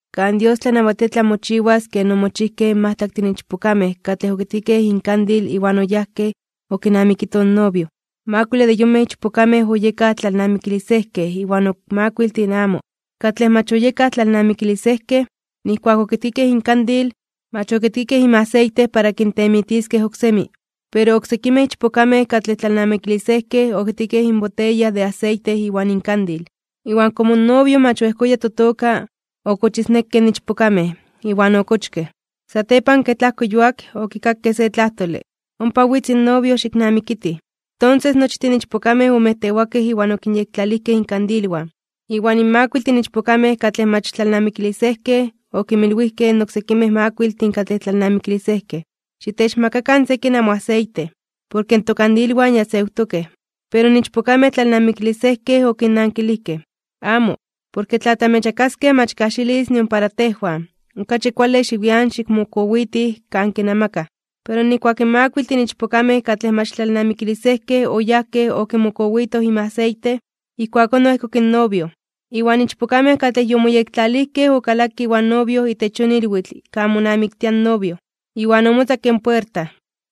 ’Kan Dios tlanawatia tlamochiwas ken omochijkej in majtlaktin ichpokamej katlej okitkikej inkandil iwan oyajkej okinamikitoj in novio. Makuile de yonmej ichpokamej oyekaj tlalnamikilisejkej iwan ok makuiltin amo. Katlej mach oyekaj tlalnamikilisejkej, nijkuak okitkikej inkandil, mach okitkikej inmaseite para kintemitiskej oksemi. Pero oksekimej ichpokamej katlej tlalnamikilisejkej okitkikej inboteya de aseite iwan inkandil. Iwan komo in novio mach oejkoya totoka, okochisnekkej in ichpokamej, iwan okochkej. Satepan, kej tlajko yuak, okikakej se tlajtole: “¡Ompa witz in novio, xiknamikitij!” Tonses nochtin in ichpokamej omejtewakej iwan okinyektlalijkej inkandilwan. Iwan in makuiltin ichpokamej katlej mach tlalnamikilisejkej okinmilwijkej in oksekimej makuiltin katlej tlalnamikilisejkej: “Xitechmakakan sekin namoaseite, porke tokandilwan ya sewtokej.” Pero in ichpokamej tlalnamikilisejkej okinnankilijkej: “Amo, porke tla tamechmakaskej mach kajxilis nion para tejwan. Okachi kuale xiwian xikmokowitij kan kinamakaj.” Pero nijkuak in makuiltin ichpokamej katlej mach tlalnamikilisejkej oyajkej okimokowitoj inmaseite, ijkuakón oejkok in novio. In ichpokamej katlej yomoyektlalijkej okalakej iwan novio itech yon ilwitl kan monamiktia in novio, iwan omotzakke in puerta.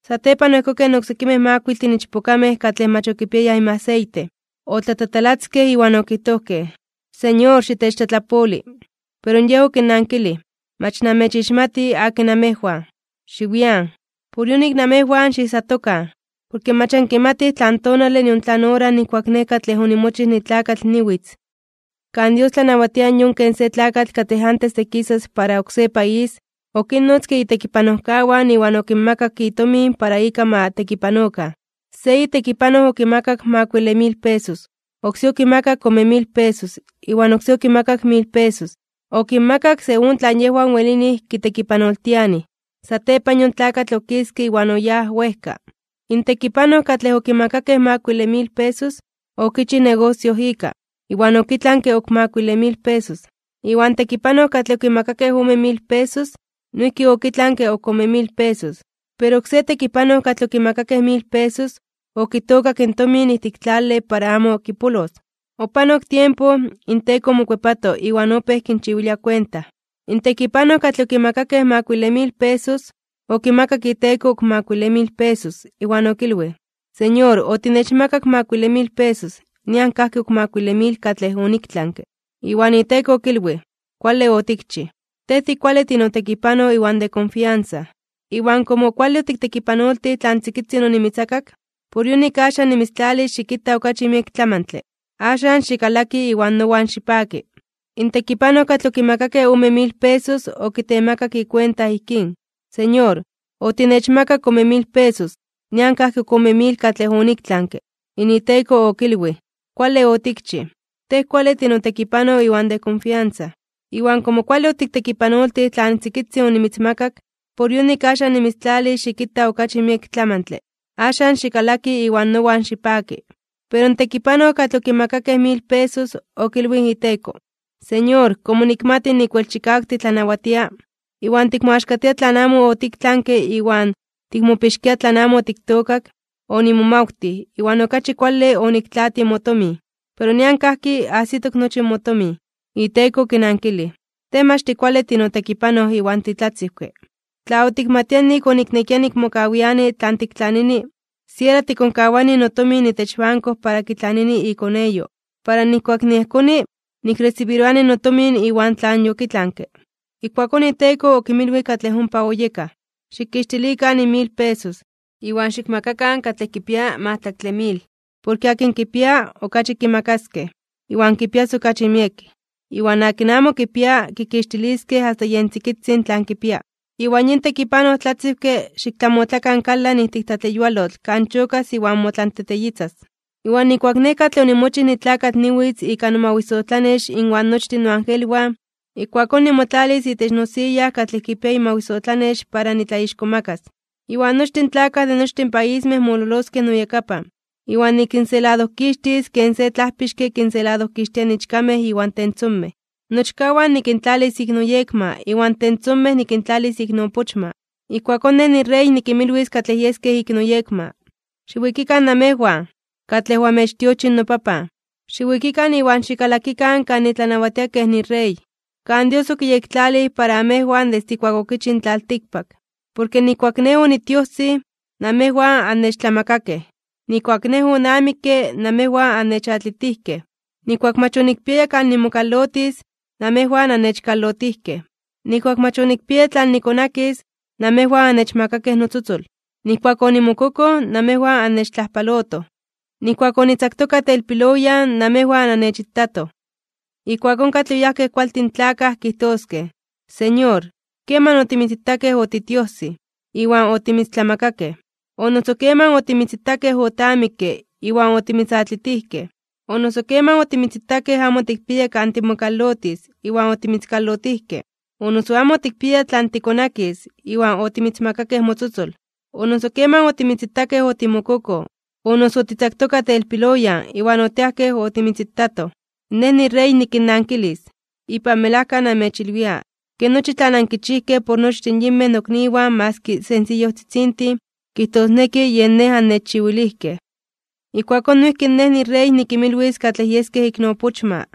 Satepan oejkokej in oksekimej makuiltin ichpokamej katlej mach okipiayaj inmaseite, otlatatalatzkej iwan okijtojkej: “¡Señor, xitechtlatlapoli!” Pero yej okinnankilij: “¡Mach namechixmati akin namejwan! ¡Xiwian!” Ijkuakón Jesús okinmilwij: ―Por yonik, namejwan xiijsatokan, porke mach ankimatij tlan tonale nion tlan ora nijkuak Nej katlej onimochij nitlakatl niwitz. ’Kan Dios tlanawatia yon ken se tlakatl katlej antes de kisas para oksé país, okinnotzke itekipanojkawan iwan okinmakak itomin para ika ma tekipanokan. ’Se itekipanoj okimakak makuile mil pesos, oksé okimakak ome mil pesos, iwan oksé okimakak mil pesos. Okinmakak según tlan yejwan welinij kitekipanoltianij. Satepan yon tlakatl okiske iwan oyáj wejka. In tekipanoj katlej okimakakej makuile mil pesos, okichij negosio ika, iwan okitlanke ok makuile mil pesos. Iwan tekipanoj katlej okimakakej ome mil pesos, noijki okitlanke ok ome mil pesos. Pero oksé tekipanoj katlej okimakakej mil pesos, okitookak in tomin ijtik tlale para amo kipolos. ’Opanok tiempo, inteko omokuepato, iwan opéj kinchiwilia kuenta. In tekipanoj katlej okimakakej makuile mil pesos, okimakak iteko ok makuile mil pesos, iwan okilwij: “Señor, otinechmakak makuile mil pesos, nian kajki ok makuile mil katlej oniktlanke.” Iwan iteko okilwij: “Kuale otikchij. Tej tikuale tinotekipanoj iwan de konfiansa. Iwan komo kuale otiktekipanoltij tlan tzikitzin onimitzmakak, por yonik axan nimitztlalis xikita okachi miek tlamantle. Axan, xikalaki iwan nowan xipaki.” In tekipanoj katlej okimakakej ome mil pesos okitemakak ikuenta ijkín: “Señor, otinechmakak ome mil pesos, nian kajki ok ome mil katlej oniktlanke.” In iteko okilwij: “Kuale otikchij. Tej tikuale tinotekipanoj iwan de konfiansa. Iwan komo kuale otiktekipanoltij tlan tzikitzin onimitzmakak, por yonik axan nimitztlalis xikita okachi miek tlamantle. Axan, xikalaki iwan nowan xipaki.” Pero in tekipanoj katlej okimakakej mil pesos, okilwij in iteko: “Señor, komo nikmati nik wel chikawak titlanawatia, iwan tikmoaxkatia tlan amo otiktlanke iwan tikmopixkia tlan amo otiktookak, onimomawtij, iwan okachi kuale oniktlaatij motomin. Pero nian kajki, ajsitok nochi motomin.” Iteko okinankilij: “Tej mach tikuale tinotekipanoj iwan titlatziwke, tla otikmatia nik oniknekia nikmokawiani tlan tiktlanini, siera tikonkawani notomin itech banko para kitlanini ikoneyo, para nijkuak niejkoni, nikresibiroani notomin iwan tlan yokitlanke.” Ijkuakón iteko okinmilwij katlej ompa oyekaj: “Xikixtilikan in mil pesos, iwan xikmakakan katlej kipia majtlaktle mil. Porke akin kipia, okachi kimakaskej, iwan kipias okachi miek. Iwan akin amo kipia, kikixtiliskej asta yen tzikitzin tlan kipia. Iwan yin tekipanoj tlatziwke, xiktlamotlakan kalan ijtik tlatleyualotl kan chokas iwan motlanteteyitzas.” ’Iwan nijkuak Nej katlej onimochij nitlakatl niwitz ika nomawisotlanex inwan nochtin noagelwan, ijkuakón nimotlalis itech nosiya katlej kipia imawisotlanex para nitlaixkomakas (nitlatzonmanas). Iwan nochtin in tlakaj de nochtin paismej mololoskej noyakapan, iwan nikinseladojkixtis ken se tlajpixke kinseladojkixtia ichkamej iwan tentzomej. Nochkawan nikintlalis ik noyekma iwan tentzomej nikintlalis ik noopochma. Ijkuakón Nej niRey nikinmilwis katlej yeskej ik noyekma: “Xiwikikan namejwan, katlej oamechtiochij noPapan. Xiwikikan iwan xikalakikan kan nitlanawatia kej niRey, kan Dios otlayektlalij para amejwan desde ijkuak okichij in tlaltikpak. Porke nijkuak Nej onitiojsij, namejwan annechtlamakakej. Nijkuak Nej onamikke, namejwan annechatlitijkej. Nijkuak mach onikpiaya kan nimokalotis (nimotepialtis), namejwan annechkalotijkej. Nijkuak mach onikpiaya tlan nikonakis, namejwan annechmakakej notzotzol. Nijkuak onimokokoj, namejwan annechtlajpalotoj. Nijkuak onitzaktoka telpiloyan, namejwan annechitatoj.” Ijkuakón katlej oyajkej kualtin tlakaj kijtoskej: “Señor, ¿keman otimitzitakej otitiojsij, iwan otimitztlamakakej? ¿O noso keman otimitzitakej otamikke, iwan otimitzatlitijkej? ¿O noso keman otimitzitakej amo otikpiaya kan timokalotis, iwan otimitzkalotijkej, o noso amo otikpiaya tlan tikonakis, iwan otimitzmakakej motzotzol? ¿O noso keman otimitzitakej otimokokoj, o noso otitzaktoka telpiloyan, iwan otiajkej otimitzitatoj?” Nej niRey nikinnankilis: “Ipan melajka namechilwia, ke nochi tlan ankichijkej por nochtin yinmej nokniwan maski sensiyojtzitzintin, kijtosneki yen Nej nannechchiwilijkej.” ’Ijkuakón noijki Nej niRey nikinmilwis katlej yeskej ik noopochma: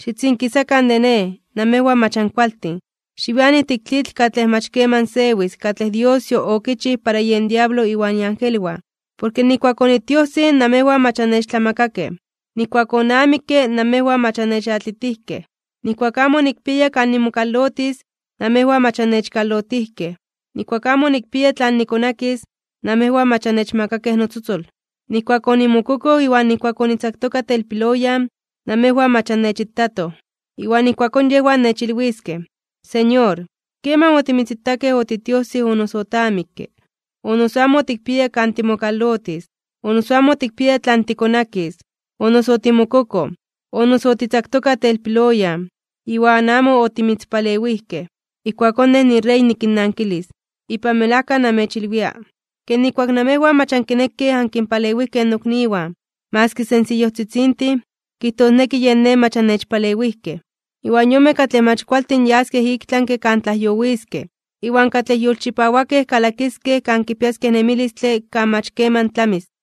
“Xitzinkisakan de Nej, namejwan mach ankualtin. Xiwian ijtik tlitl katlej mach keman sewis katlej Dios okichij para yen diablo iwan iangelwan. Porke ijkuak onitiojsij, namejwan mach annechtlamakakej. Nijkuak onamikke, namejwan mach annechatlitijkej. Nijkuak amo onikpiaya kan nimokalotis, namejwan mach annechkalotijkej. Nijkuak amo onikpiaya tlan nikonakis, namejwan mach annechmakakej notzotzol. Nijkuak onimokokoj iwan nijkuak onitzaktoka telpiloyan, namejwan mach annechitatoj.” Iwan ijkuakón yejwan nechilwiskej: “Señor, ¿keman otimitzitakej otitiojsij o noso otamikke, o noso amo otikpiaya kan timokalotis, o noso amo otikpiaya tlan tikonakis, o noso otimokokoj, o noso otitzaktoka telpiloyan, iwan amo otimitzpalewijkej?” Ijkuakón Nej niRey nikinnankilis: “Ipan melajka namechilwia, ke nijkuak namejwan mach ankinekej ankinpalewijkej nokniwan, maski sensiyojtzitzintin, kijtosneki yen Nej mach annechpalewijkej.” Iwan yonmej katlej mach kualtin yaskej iktlanke (ik tlami) kan tlajyowiskej, iwan katlej yolchipawakej kalakiskej kan kipiaskej nemilistle kan mach keman tlamis.